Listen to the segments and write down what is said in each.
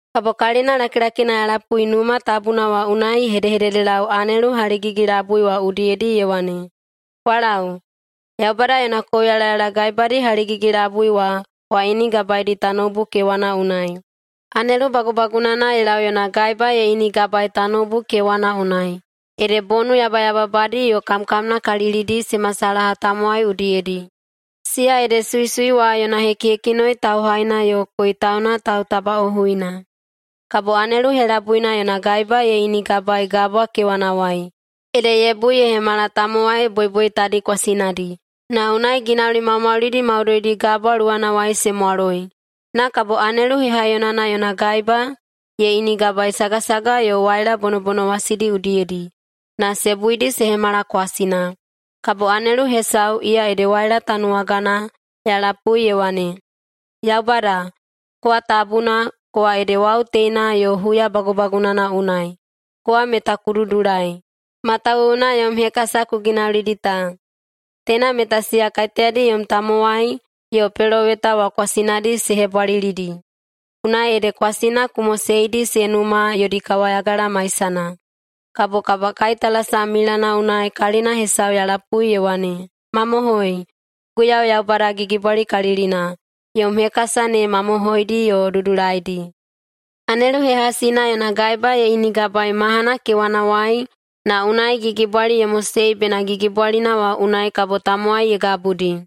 Kabo kalina lakilakina ya lapui Numa Tabuna wa unai ye hedehededelau anelu haligigi-labui wa udiyedi ye wane, “Kwa lau, Yaubada yona kouyalayala gaebadi haligigi-labui wa kwa inigabaedi tanoubu kewana unai.” Anelu bagubagunana ye lau yona gaeba ye inigabaei tanoubu kewana unai, ede bonu yabayababadi yo kamkamnakalilidi se masalaha tamowai udiyedi, siya ede suisui wa yona hekihekinoi tauhaina yo koitauna tautabaꞌohuina. Kabo anelu helabuina yona gaeba ye inigabaei gabwa kewanawai, ede ye bui ye hemala tamowai boiboitadi kwasinadi, na unai ginauli maumaulidi maudoidi gabwa luwanawai se mwaloi. Na kabo anelu hehaiyonana yona gaeba ye inigabaei sagasaga yo waila bonobonowasidi udiyedi, na se buidi se hemala kwasina. Kabo anelu hesau, iya ede waila tanuwagana, ya lapui ye wane, “Yaubada, kowa Tabuna, kowa ede wau teina yo huya bagubagunana unai. Kowa meta ku dudulai, matawuwuna yom hekasa ku ginaulidi ta. Teina meta siya kaiteyadi yom tamowai yo peloweta wa kwasinadi se hebwalilidi, unai ede kwasina ku moseidi se numa yodi kawayagala maisana.” Kabo kabakaitalasam milana unai kalina hesau ya lapui ye wane, “Mamohoi, Guiyau Yaubada Gigibwalikalilina, yom hekasa ne mamohoidi yo dudulaidi!” Anelu hehasina yona gaeba ye inigabaei mahana kewanawai na unai gigibwali ye mosei bena gigibwalina wa unai kabo tamowai ye gabudi.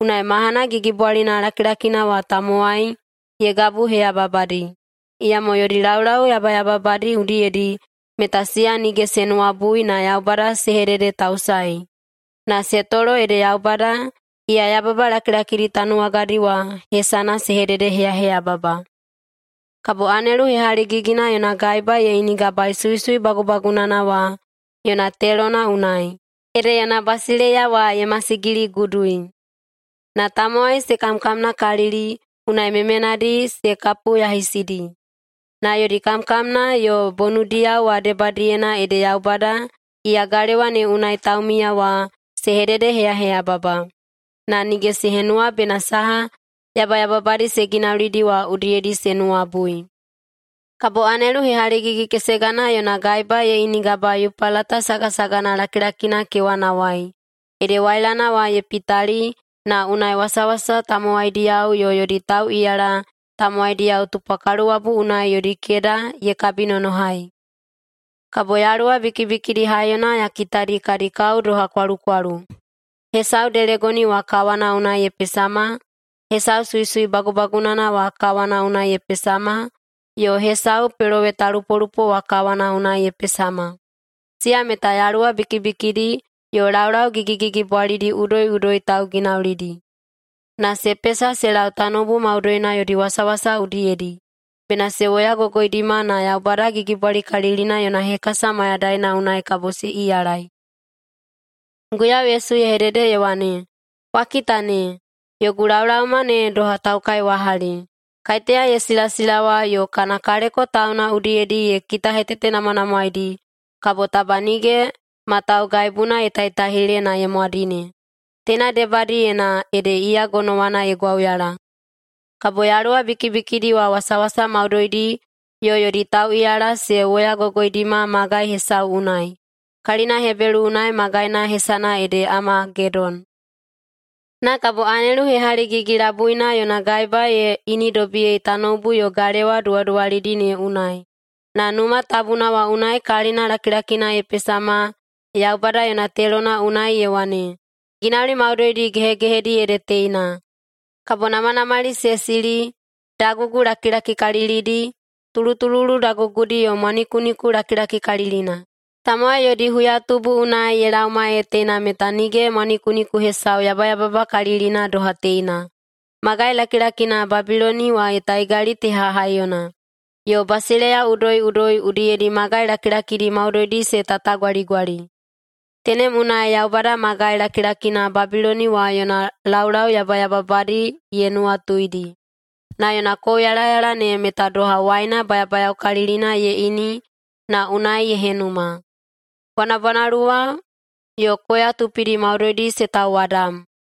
Unai mahana gigibwalina lakilakina wa tamowai ye gabuheyababadi, iyamo yodi laulau yabayababadi udiyedi meta siya nige se nuwabui na Yaubada se hededetausae, na se tolo ede Yaubada, iya yababa lakilakidi tanuwagadi wa, hesana se hededeheyaheyababa. Kabo anelu hehaligigina yona gaeba ye inigabaei suisui bagubagunana wa yona telona unai, ede yona basileiya wa ye masigiligudui. Na tamowai se kamkamnakalili, unai memenadi se kapuyahisidi. Na yodi kamkamna yo bonudiyao wa debadiyena ede Yaubada, iya galewa ne unai taumiya wa, se hededeheyaheyababa. Na nige se henuwa bena saha yabayababadi se ginaulidi wa udiyedi se nuwabui. Kabo anelu hehaligigi-kesegana yona gaeba ye inigabaei Yupalata sagasagana lakilakina kewanawai, ede wailana wa ye pitali, na unai wasawasa tamowaidiyao yo yodi tauꞌiyala tamowaidiyao tupwa kaluwabu unai yodi keda ye kabinonohai. Kabo yaluwa bikibikidi haiyona ya kitadi kadi kao doha kwalukwalu. Hesau delegoni wa kawana unai ye pesama, hesau suisui bagubagunana wa kawana unai ye pesama, yo hesau pelowetalupolupo wa kawana unai ye pesama. Siya meta yaluwa bikibikidi yo laulau gigigigibwalidi udoiꞌudoi tauginaulidi. Na se pesa se lau tanoubu maudoina yodi wasawasa udiyedi, bena se woyagogoidima na Yaubada Gigibwalikalilina yona hekasa mayadaina unai kabo se iyalai. Guiyau Yesu ye hedede ye wane, “Kwa kita ne! Yogu laolaoma ne doha taukaiwahali! Kaiteya ye silasilawa yo kana kaleko tauna udiyedi ye kitahetetenamwanamwaeidi, kabo taba nige ma taugaibuna ye taitaihile na ye mwadine. Teina debadiyena ede iya gonowana ye gwauyala.” Kabo yaluwa bikibikidi wa wasawasa maudoidi yo yodi tauꞌiyala se woyagogoidima magai hesau unai, kalina Hebelu unai magaina hesana ede Amagedon. Na kabo anelu hehaligigi-labuina yona gaeba ye inidobiyei tanoubu yo galewa duwaduwalidi ne unai, na Numa Tabuna wa unai kalina lakilakina ye pesama Yaubada yona telona unai ye wane, “Ginauli maudoidi gehegehedi ede teina!” Kabo namanamali se sili, dagugu lakilakikalilidi, tulutululu dagugudi yo mwanikuniku lakilakikalilina. Tamowai yodi huyatubu unai ye laoma ee teina meta nige mwanikuniku hesau yabayababakalilina doha teina. Magai lakilakina Babiloni wa ye taigali teha haiyona, yo basileiya udoiꞌudoi udiyedi magai lakilakidi maudoidi se tatagwaligwali. Tenem unai Yaubada magai lakilakina Babiloni wa yona laulau yabayababadi ye nuwatuidi. Na yona kouyalayala ne meta doha waina bayabayaokalilina ye ini na unai ye henuma. Bwanabwanaluwa yo koya tupidi maudoidi se tauwadam.